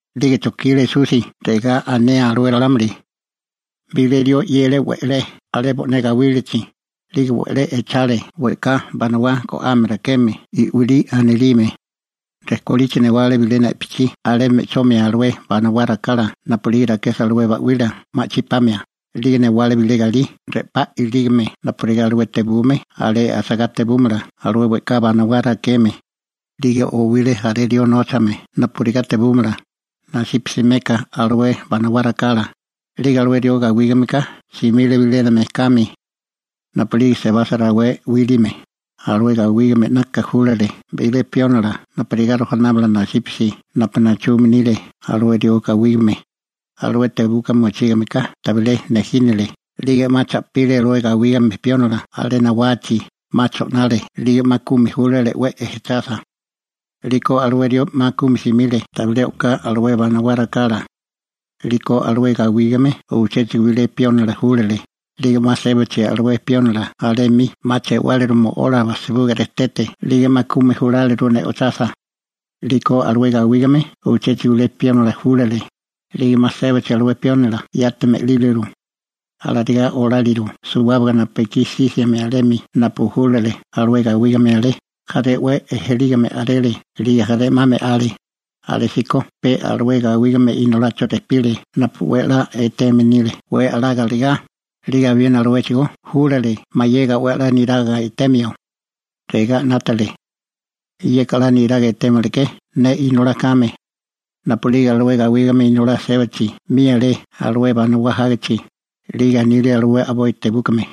'Lige chojkile Esusi regá anea alué ralámuli: ―Bilé rió 'yele we'lé alé bo'né gawílachi, 'lige we'lé echale we'ká banawá go'ame rakeme i'wilí anilime. Rejkolichi newale bilena i'pichí alé me'chomia alué banawá rakala napu'lige rakesa alué ba'wila ma'chí pamia, 'lige newale bilé galí re'pá ilígame napurigá alué tebume alé asagá tebúmala alué we'ká banawá rakeme. › 'Lige owile jaré rió nóchame napurigá tebúmala, nasípasi meka alué banawá rakala, 'lige alué rió gawígameka simile bilénami mejkami. Napu'lige sebasa rawé 'wíliame, alué gawígame 'naka júlale bilé piónila napurigá rojanámala nasípasi napu nachume nile alué rió gawígame. Alué tebuka mochígameka tabilé nejínile 'lige 'ma cha'pile alué gawígame piónila alé nawachi, 'ma cho'nale 'lige 'ma kumi júlale 'we ejechasa. 'Liko alué rió 'ma kumi simile tabilé o'ká alué banawá rakala. 'Liko alué gawígame uchéchigo bilé piónila júlale, 'lige 'ma sébachi alué piónila alé 'mi 'ma che'wáliru mo'ola bajsibuga rejtete 'lige 'ma kumi juláliru ne'ochasa. 'Liko alué gawígame uchéchigo bilé piónila júlale, 'lige 'ma sébachi alué piónila yati me'líliru. Alarigá oláliru suwábaga napu ekí sísiame alemi napu júlale alué gawígame alé. Jaré 'we ejelígame a'rele 'lige jaré 'ma me'ale. › Alésíko pe alué gawígame inolacho rejpile napu 'we a'lá eteme nile 'we a'lá galegá, 'lige abiena aluéchigó júlale mayega 'we a'lá niraga etemio. Regá 'nátale: «Yeka 'la niraga etémalaké ne inolá kame.» Napu'lige alué gawígame inolá sébachi 'mi alé alué banawá jágichi, 'lige anile alué a'boi tebúkame: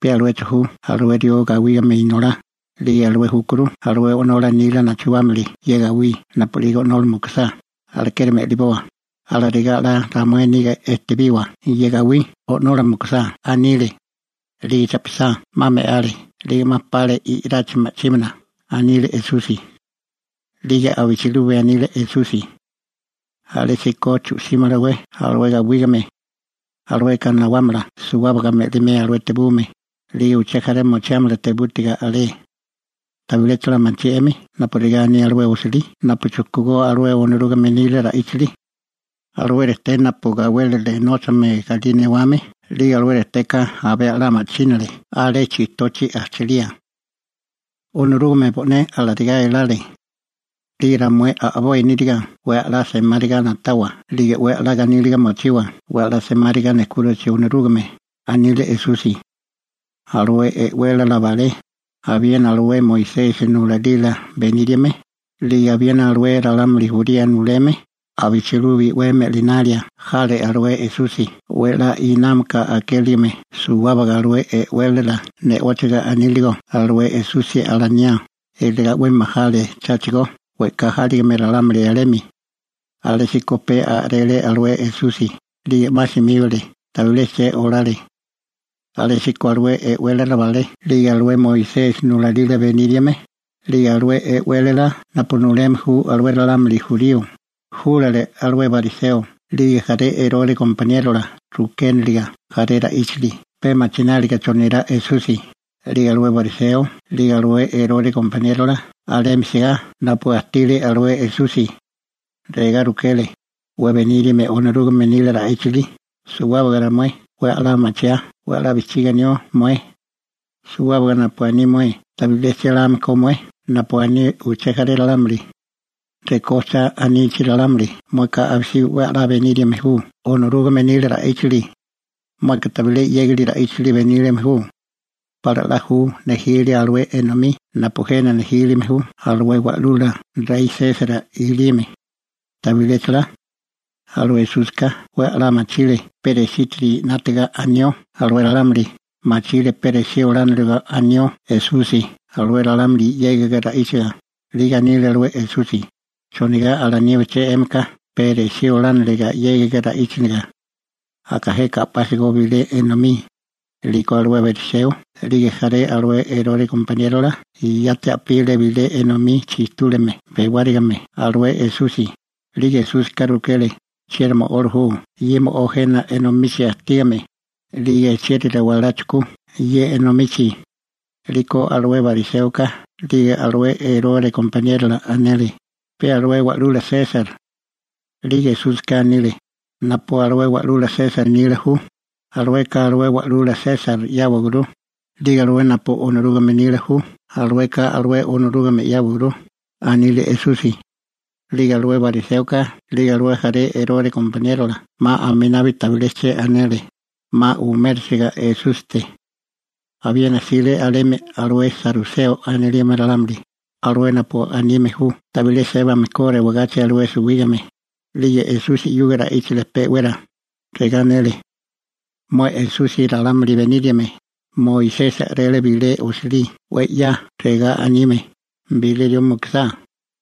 «Pe aluecho ju alué rió gawígame inolá, 'lige alué júkuru alué o'nola nila nachuámili ye gawí napu'lige o'nola mukusá, alekeri me'liboa, alarigá 'la ramué niga ejtebiwa ye gawí o'nola mukusá», anile. 'Lige cha'pisá 'ma me'ale 'lige 'ma pale i'rachi ma'chímana ―anile Esusi. 'Lige abichilubi anile Esusi: ―¿Alésíko chu'símalawé alué gawígame? Alueka nawámala suwábaga me'limea alué tebume, 'lige uché jaré mochiámala tebútiga alé. › ¿Tabiléchala machí 'emi napurigá aní alué osilí napu chujkú Onorúgame nila ra'íchili? Alué rejté napu gawélile nóchame galí newame, 'lige alué rejteka abé a'lá ma'chínale alé chijtochi ajchalía. Onorúgame bo'né alarigá elale. 'Lige ramué a'boi níriga 'we a'lá semáriga na'tawa 'lige 'we a'lá ganíliga mochiwa 'we a'lá semáriga nejkúrichi Onorúgame ―anile Esusi. Alué e'wélala balé, abiena alué Moisesi nulalila beníriame, 'lige abiena alué ralámuli jurío nuleme, abichilubi 'we me'linalia jale alué Esusi 'we a'lá inámaka akéligime suwábaga alué e'wélala ne'óchiga aníligo alué Esusi alaniá, iligá 'we majale cháchigo we'ká jáligame ralámuli alemi. Alésíko pe a'rele alué Esusi 'lige 'ma simíbale, tabilé che olale. Alésíko alué e'wélala balé 'lige alué Moisesi nulalila beníriame, 'lige alué e'wélala napu nuleme ju alué ralámuli jurío, júlale jaré bariseo 'lige jaré Erore gompaniérola rukéniliga jaré ra'íchili pe machináliga chonirá Esusi. 'Lige alué bariseo 'lige alué Erore gompaniérola alemi sigá napu ajtile alué Esusi. Regá rukele: ―Mué beníriame Onorúgame nila ra'íchili, suwábaga ramué 'we a'lá machiaa 'we a'lá bijchiga anió mué suwábaga napu aní mué. Tabilé chéláme ko mué napu aní uché jaré ralámuli. Rekó cha anichi ralámuli mueka abisibi 'we a'lá beníriame ju Onorúgame nila ra'íchili. Mueka tabilé 'yégali ra'íchili beníriame ju. ¿Pala 'la ju nejilia alué enomí napu jena nejílime ju alué wa'lula rey Sesar i'lime? ¿Tabiléchala? Alué Esúsika 'we a'lá machile pe resítiri 'nátaga anió alué ralámuli, machile pe resí olániliga anió Esusi alué ralámuli 'yégiga ra'íchanelega, 'lige anile alué Esusi: ―¿Chonigá alaníbiché 'émika pe resí olániliga 'yégiga ra'íchaga? Aka jeka a'pásigo bilé enomí. 'Liko alué bariseo 'lige jaré alué Erore gompaniérola yati a'pile bilé enomí chijtúligame bewárigame alué Esusi, 'lige Esúsika rukele: ―¿Chieri mo'ola ju ye mo'ó jena enomichi ajtígame, 'lige chieri rewalá chujkú ye enomichi? 'Liko alué bariséoka 'lige alué Erore gompaniérola anele: ―Pe alué Wa'lula Sesar. 'Liko Esúsika anile: ―Napu alué Wa'lula Sesar nila ju, alueka alué Wa'lula Sesar 'yáwaguru, 'lige alué napu Onorúgame nila ju, alueka alué Onorúgame 'yáwaguru ―anile Esusi. 'Lige alué bariséoka 'lige alué jaré Erore gompaniérola 'ma aminabi tabilé che anele, 'ma umérasiga Esúsite. Abiena jsile alemi alué saruseo anilime ralámuli, alué napu anime ju tabilé sébame ko rewagachi alué suwígame, 'lige Esusi 'yuga ra'íchale pe'wera, regá anele: ―Mué Esusi ralámuli beníriame, Moisesi a'rele bilé osilí 'we 'ya regá anime: Bilé rió mukusá,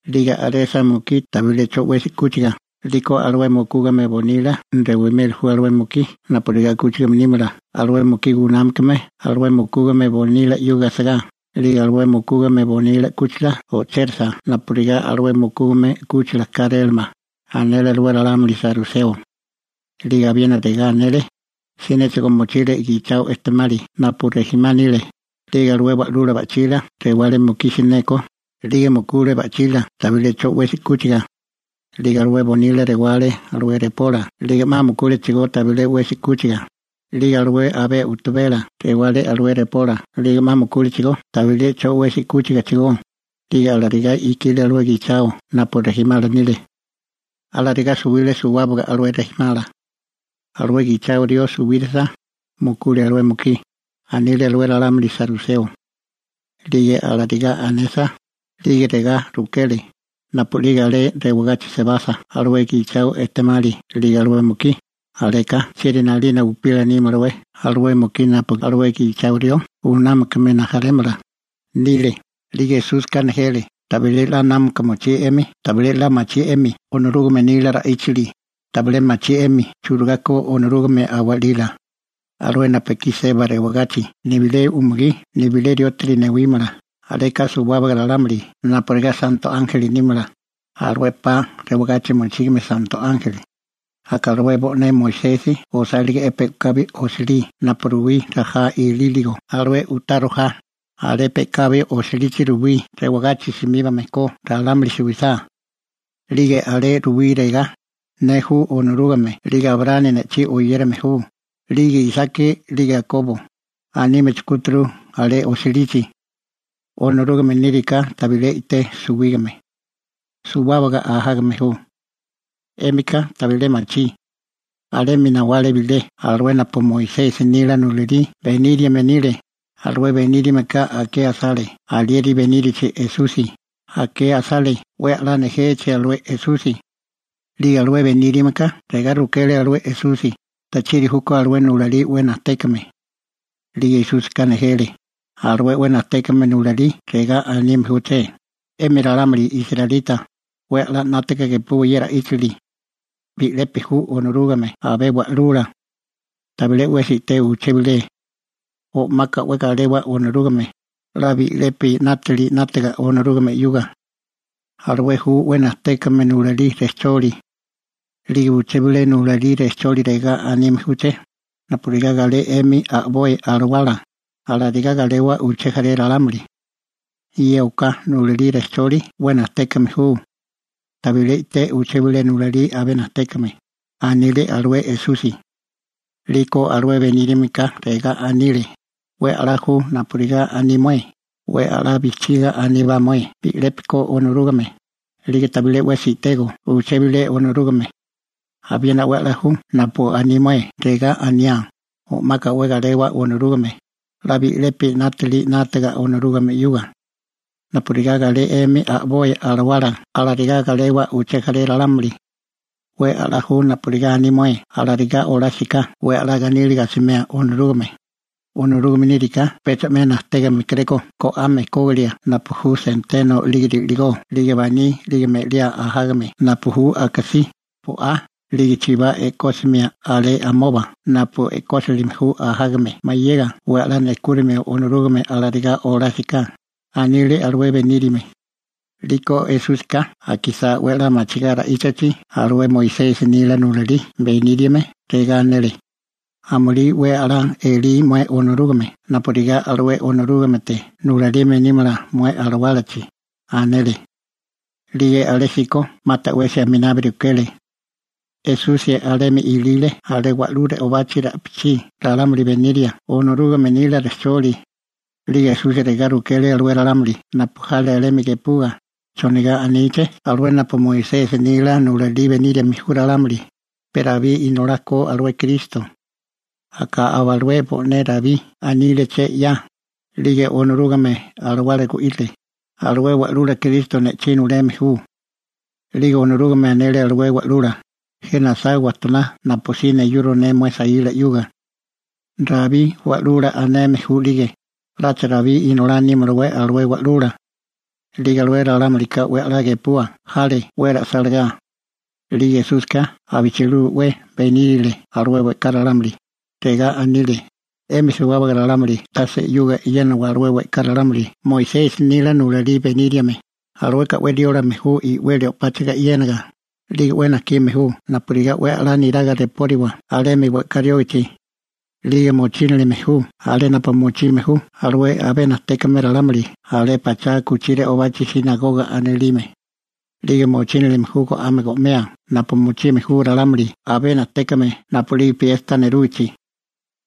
'lige a'resa mukí tabilé 'cho 'wesi 'kúchiga, 'liko alué mukúgame bonila rewimeli ju alué mukí napurigá 'kúchigame nímala alué mukí gunámakame alué mukúgame bonila 'yuga asigá, 'lige alué mukúgame bonila 'kúchila o'chérisa napurigá alué mukúgame 'kúchila kárélamala ―anele alué ralámuli saruseo. 'Lige abiena regá anele: ―Sinéchigo mochile gichao ejtemali napu rejimá nile, 'lige alué wa'lula ba'chila rewale mukí sineko, 'lige mukule ba'chila tabilé 'cho 'wesi 'kúchiga. 'Lige alué bonila rewale alué repola 'lige 'ma mukúlechigó tabilé 'cho 'wesi 'kúchiga, 'lige alué abé u'tabela rewale alué repola 'lige 'ma mukúlechigó tabilé 'cho 'wesi 'kúchigachigó. 'Lige alarigá ikile alué gichao napu chega rijimala nile. Alarigá suwile suwábaga alué rijimá. Alué gichao ejtemali suwírisa, mukule alué mukí ―anile alué ralámuli saruseo. 'Lige alarigá anesa, 'lige regá rukele: ―Napu'lige alé rewagachi sebasa alué gichao ejtemali 'lige alué mukí, aleka ¿chieri 'nalina upila nímalawé alué mukí napu alué gichao rió gunámakame nile? 'Lige Esúsika nejele: ―Tabilé 'la námaka mochí 'emi tabilé 'la machí 'emi Onorúgame nila ra'íchili, tabilé machí 'emi churigá ko Onorúgame a'walila. Alué napu ekí seba rewagachi nibilé umugí nibilé riótiri newímala, aleka suwábaga ralámuli napurigá santo ánjeli nímala, alué 'pa rewagachi mochígame santo ánjeli. Aka alué bo'né Moisesi osálige'é pe'kabi osilí napu ruwí rajá ilíligo alué u'tá rojá, alé pe'kabi osilichi ruwí rewagachi simíbame ko ralámuli suwisá. 'Lige alé ruwí regá: «Ne ju Onorúgame 'lige Abraámi ne'chí oyérame ju, 'lige Isaki 'lige Akobo», anime chujkúturu alé osilichi. Onorúgame níriká tabilé i'té suwígame. Suwábaga ajágame ju. 'Émika tabilé machí. Alemi nawale bilé alué napu Moisesi nila nulalí beníriame nile, alué benírameka akea asale alieri benírachi Esusi, akea asale 'we a'lá nejechi alué Esusi. 'Lige alué benírameka regá rukele alué Esusi: ―¿Tachiri júkó alué nulalí 'we najtékame? 'Lige Esúsika nejele: ―Alué 'we najtékame nulalí regá anime júché: «'Emi ralámuli israelita, 'we a'lá 'nátaga gepúwaká ye ra'íchili. Bi'lepi ju Onorúgame abé Wa'lula. Tabilé 'wesi i'té uché bilé. O'maka 'we galewa Onorúgame, 'la bi'lepi 'nátili 'nátaga Onorúgame 'yuga.» Alué ju 'we najtékame nulalí rejcholi. 'Lige uché bilé nulalí rejcholi regá anime júché: «Napurigá galé 'emi a'boi alawala, alarigá galewa uché jaré ralámuli.» Ye oká nulalí rejcholi 'we najtékame ju. Tabilé i'té uché bilé nulalí abé najtékame ―anile alué Esusi. 'Liko alué benírameka regá anile: ―'We a'lá ju napurigá aní mué, 'we a'lá bijchiga aníbá mué bi'lepi ko Onorúgame, 'lige tabilé 'wesi i'tego uché bilé Onorúgame. Abiena 'we a'lá ju napu aní mué, regá aniá: «O'maka 'we galewa Onorúgame, 'la bi'lepi 'nátili 'nátaga Onorúgame 'yuga. Napurigá galé 'emi a'boi alawala alarigá galewa uché jaré ralámuli.» 'We a'lá ju napurigá aní mué alarigá olásiká 'we a'lá ganíliga asimeo Onorúgame. Onorúgame níriká pecha 'me najtékame kéréko go'ame kógilia napu ju senteno 'lige ri'ligó 'lige baní 'lige me'liá ajágame napu ju akasí, bo'á, 'lige chibá e'kósimia alé amoba napu e'kósilime ju ajágame mayega 'we a'lá nejkúrimio Onorúgame alarigá olásiká ―anile alué beníriame. 'Liko Esúsika akisá 'we a'lá machigá ra'íchachi alué Moisesi nila nulalí beníriame, regá anele: ―Amulí 'we a'lá elí mué Onorúgame napurigá alué Onorúgamete nulalime nímala mué alawálachi ―anele. 'Lige alésíko 'ma ta'wesi aminabi rukele. Esusi alemi ilile alé wa'lú re'obachi ra'pichí ralámuli beniria Onorúgame nila rejcholi. 'Lige Esusi regá rukele alué ralámuli napu jale alemi gepua: ―¿Chonigá aníché alué napu Moisesi nila nulalí beníriame ju ralámuli, pe Rabí inolá ko alué Kristo? Aka aba alué bo'né Rabí aníleché 'ya, 'lige Onorúgame Alawala gu'írile: Alué Wa'lula (Kristo) ne'chí nuleme ju. 'Lige Onorúgame anele alué Wa'lula: «Jena asá wajtoná napusí neyuro ne mué saíla 'yuga.» Rabí «Wa'lula» aneme ju 'lige ¿'lacha Rabí inolá nímalawé alué Wa'lula? 'Lige alué ralámulika 'we a'lá gepua jale 'we ra'sálagá. 'Lige Esúsika abichilubi 'we benírile alué we'ká ralámuli, regá anile: ―'Emi suwábaga ralámuli tase 'yuga e'yénawa alué we'ká ralámuli Moisesi nila nulalí beníriame, alueka 'we riólame ju i'weli o'páchaga e'yénaga, 'lige 'we najkime ju napurigá 'we a'lá niraga repóriwa alemi we'ká riógichi. 'Lige mochínilime ju alé napu mochime ju alué abé najtékame ralámuli alé pachá u'kuchí re'obachi «sinagoga» anilime. 'Lige mochínilime ju go'ame go'mea napu mochime ju ralámuli abé najtékame napu'lige piesta nerúgichi.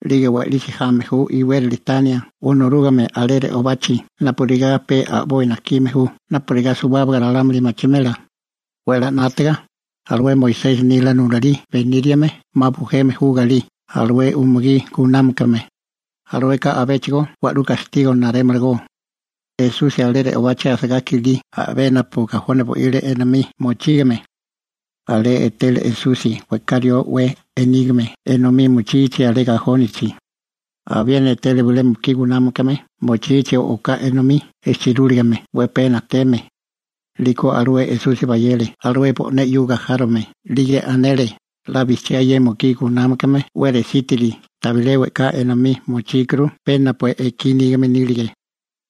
'Lige we'lisi jame ju iwérali tania Onorúgame alé re'obachi napurigá pe a'boi najkime ju napurigá suwábaga ralámuli machimela. 'We a'lá 'nátaga, alué Moisesi nila nulalí beníriame 'ma bujeme ju galí alué umugí gunámakame. Alueka abéchigo wa'lú gastigo narémalagó. Esusi alé re'obachi asagá kilí a'bé napu gajoni bo'ile enomí mochígame, alé etele Esusi we'ká rió 'we inígame enomí mochichi alé gajónichi. Abiena etele bilé mukí gunámakame mochichi oká enomí ejchirúligame 'we pee najteme. 'Liko alué Esusi bayele alué bo'né 'yuga járome, 'lige anele: ―'La bijchiá ye mukí gunámakame 'we resítiri tabilé we'ká enomí mochíkuru enomí pe napu ekí nígame nílige.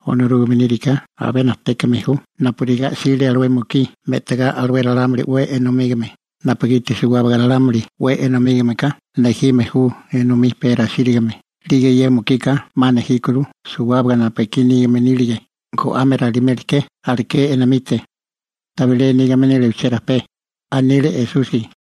Onorúgame níriká abé najtékame ju napurigá 'sile alué mukí me'tagá alué ralámuli 'we enomígame, napugiti suwábaga ralámuli 'we enomígameka nejime ju enomí pe rasírigame, 'lige ye mukika 'ma nejíkuru suwábaga napu ekí nígame nílige, go'ame raliméleké aleké enomite. Tabilé nígame nile uchérajpé ―anile Esusi.